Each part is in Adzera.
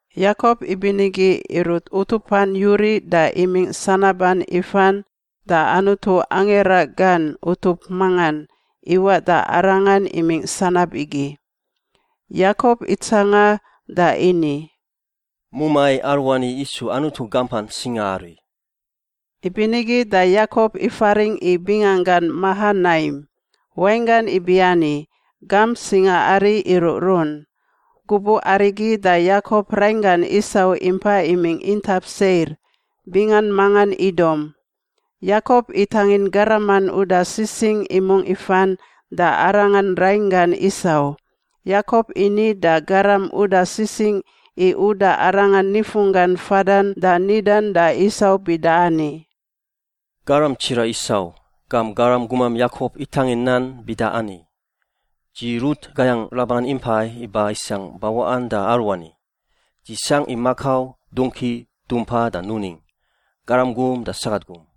Yakop ibinigi irut utupan yuriꞌ da imingꞌ sanaban ifan da Anutu angira gan utup mangan iwaꞌ da arangan imingꞌ sanab igi. Yakop itsanga da ini, “Mumai aruani isu Anutu gampan singaari.” Ibinigi da Yakop ifaringꞌ i binganggan Mahanaim, wainggan ibiani gamp singaari iruꞌrun. Gubuꞌ arigi da Yakop rainggan Isau impa imingꞌ intap Seir, bingan mangan Idom. Yakop itangin garaman uda sisingꞌ imungꞌ ifan da arangan rainggan Isau. Yakop ini da garam uda sisingꞌ i uda arangan nifunggan fadan da nidan da Isau bida ani, “Garam tsiraꞌ Isau, gam garam gumam Yakop itangin nan bida ani, ‘Dzi rut gayangꞌ Laban impai iba isangꞌ bawaꞌan da aruani. Dzi sangꞌ i makau, dongki, dumpa da nuning, garam gum da sagat gum.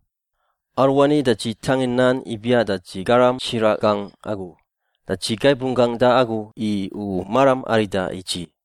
Aruani da dzi tangin nan ibiaꞌ da dzi garam tsiraꞌ gangꞌ agu da dzi gaib runggangꞌ da agu i u maram arida i dzi.’”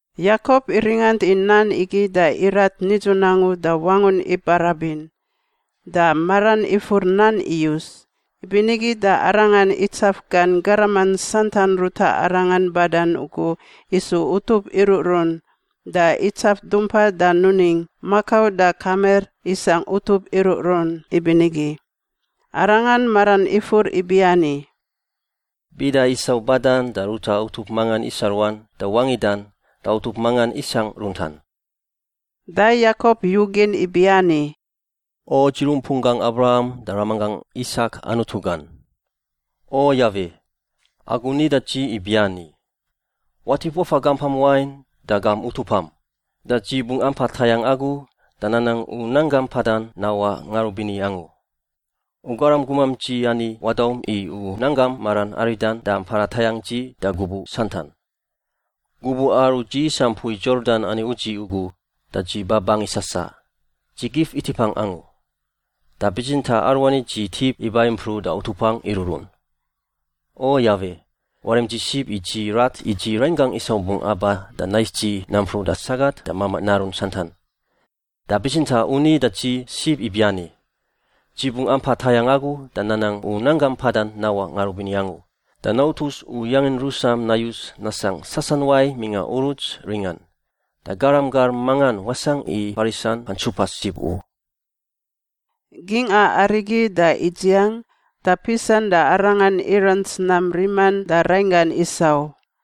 Yakop iringant i nan igi da irat nidzun angu da wangun ibarabin da maran ifur nan iyus. Ibinigi da arangan itsaf gan garaman santan ruta arangan badan ugu isu utup iruꞌrun da itsaf dumpa da nuning, makau da kamir isangꞌ utup iruꞌrun ibinigi. Arangan maran ifur ibiani, “Bida Isau badan da ruta utup mangan isa ruan da wangidan da utup mangan isangꞌ runtan.” Da Yakop yugin ibiani, “O dzi rumpunggangꞌ Abraham da ramanggangꞌ Isak Anutu gan. O Yawe, agu ni da dzi ibiani, ‘Watip wafa gampam wain da gam utupam, da dzi bungꞌ ampa tayangꞌ agu da nanang u nanggam mpadan nawaꞌ ngarubini angu.’ U garam gumam dzi ani wadaum i u nanggam maram aridan da mpada tayangꞌ dzi da gubuꞌ santan. Gubuꞌ aru dzi isa mpui Yordan ani udziꞌ ugu da dzi ba bangi sasaꞌ— dzi gif itipangꞌ angu. Da bitsintaꞌ aruani dzi tip iba impruꞌ da utupangꞌ iruꞌrun. O Yawe, warim dzi sib i dzi rat i dzi rainggangꞌ Isau bungꞌ aba da nais dzi nampruꞌ da sagat da mamaꞌ narun santan. Da bitsintaꞌ u ni da dzi sib ibiani, ‘Dzi bungꞌ ampa tayangꞌ agu da nanang u nanggam mpadan nawaꞌ ngarubini angu, da nautus u yangin rusam nayus nasangꞌ sasanuai mingꞌa uruts ringan, da garam gar mangan wasangꞌ i farisan fantsupa sib u.’” Gingꞌa arigi da idziang, da pisan da arangan irants nam riman da rainggan Isau: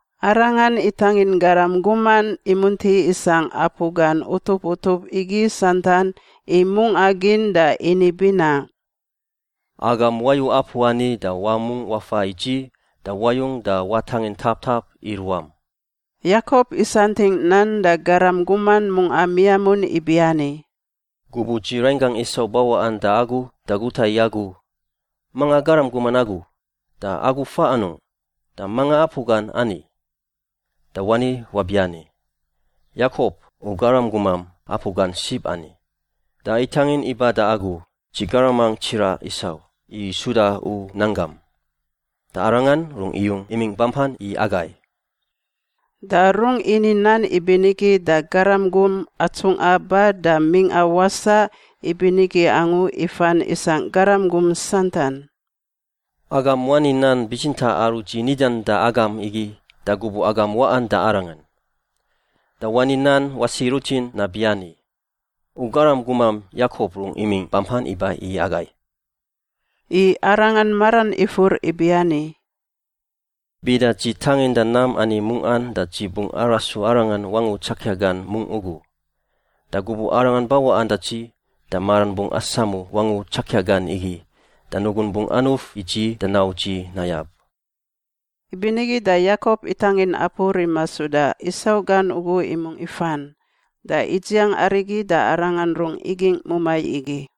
Arangan itangin garam guman imunti isangꞌ apu gan utup utup igi santan i mungꞌa gin da ini binaꞌ, “Agam wayu apu ani da wamungꞌ wafa i dzi da wayung da watangin taptap i ruam.” Yakop isantingꞌ nan da garam guman mungꞌa miamun ibiani, “Gubuꞌ dzi rainggangꞌ Isau bawaꞌan da agu da guta i agu, ‘Manga garam guman agu, da agu fa anungꞌ, da manga apu gan ani?’ Da wani wabiani, ‘Yakop, u garam gumam, apu gan sib ani. Da itangin iba da agu, dzi garamangꞌ tsiraꞌ Isau, i suda u nanggam. Da arangan rungꞌ iyung imingꞌ bampan i agai.’” Da rungꞌ ini nan ibinigi da garam gum atsungꞌa ba da mingꞌa wasaꞌ ibinigi angu ifan isangꞌ garam gum santan, “Agam wani nan bitsintaꞌ aru dzi nidan da agam igi da gubuꞌ agam waꞌan da arangan. Da wani nan wasi rutin nabiani, ‘U garam gumam Yakop rungꞌ imingꞌ bampan iba i agai.’” I arangan maran ifur ibiani, “Bida dzi tanginda nam ani mungꞌan da dzi bungꞌ arasu arangan wangu tsakia gan mungꞌ ugu. Da gubuꞌ arangan bawaꞌan da dzi da maran bungꞌ asamu wangu tsakia gan igi, da nugun bungꞌ anuf i dzi da nau dzi nayab.” Ibinigi da Yakop itangin apu rima suda Isau gan ugu imungꞌ ifan. Da idziang arigi da arangan rungꞌ igingꞌ mumai igi.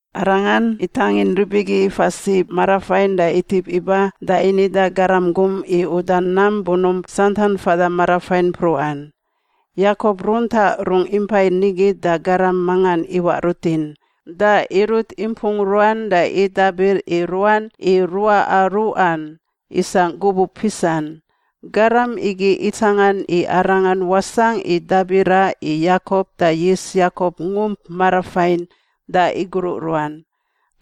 Arangan itangin rib igi ifa sib marafain da itip iba da ini da garam gum i uda nam bunump santan fada marafain mpruꞌan. Yakop runtaꞌ rungꞌ impai nigi da garam mangan iwaꞌ rutin, da irut impung ruan da idabir i ruan i ruaꞌa ruꞌan isangꞌ gubuꞌ pisan. Garam igi itsangan i arangan wasangꞌ i dabira i Yakop da yis Yakop ngump marafain da igruꞌ ruan.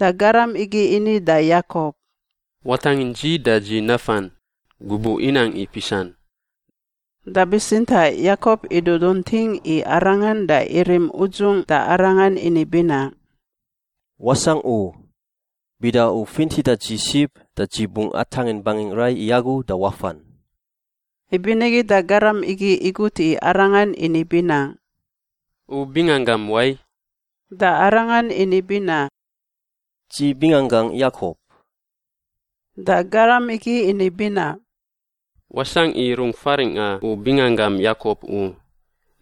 Da garam igi ini da Yakop, “Watangin dzi da dzi nafan. Gubuꞌ inang i pisan.” Da bitsintaꞌ Yakop idudunting i arangan da irim udzungꞌ da arangan ini binaꞌ, “Wasangꞌ u! Bida u fintida dzi sib da dzi bungꞌ atangin bangingꞌ rai i agu da wafan.” Ibinigi da garam igi igut i arangan ini binaꞌ, “U binganggam wai?” Da arangan ini binaꞌ, “Dzi binganggangꞌ Yakop.” Da garam igi ini binaꞌ, “Wasangꞌ i rung faringꞌa u binganggam Yakop u.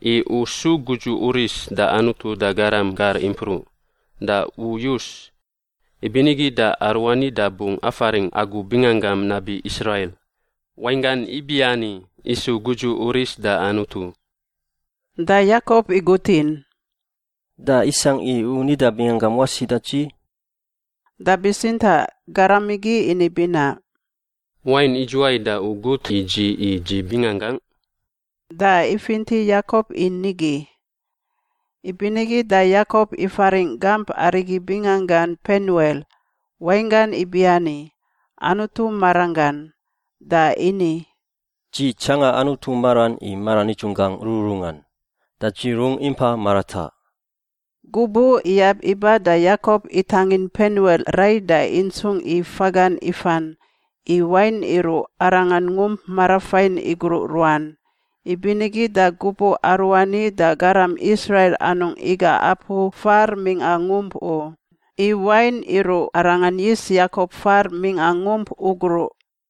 I u su gudzu uris da Anutu da garam gar impruꞌ. Da u yus. Ibinigi da aruani da bungꞌ afaringꞌ agu binganggam nabi Israil (wainggan ibiani isu gudzu uris da Anutu).” Da Yakop igutin, “Da isangꞌ i u nida binganggam wasi da dzi?” Da bitsintaꞌ garam igi ini binaꞌ, “Wain idzuwai da u gut i dzi i dzi binganggangꞌ?” Da ifinti Yakop i nigi. Ibinigi da Yakop ifaringꞌ gamp arigi binganggan Penuel (wainggan ibiani Anutu maranggan) da ini, “Dzi tsangan Anutu maran i mara nidzunggangꞌ rururungan, da dzi rungꞌ impa marataꞌ.” Gubuꞌ iyab iba da Yakop itangin Penuel rai da intsungꞌ i fagan ifan, i wain iruꞌ arangan ngump marafain igruꞌ ruan. Ibinigi da gubuꞌ aruani da garam Israil anungꞌ iga apu far mingꞌa ngump u, i wain iruꞌ arangan yis Yakop far mingꞌa ngump ugruꞌ.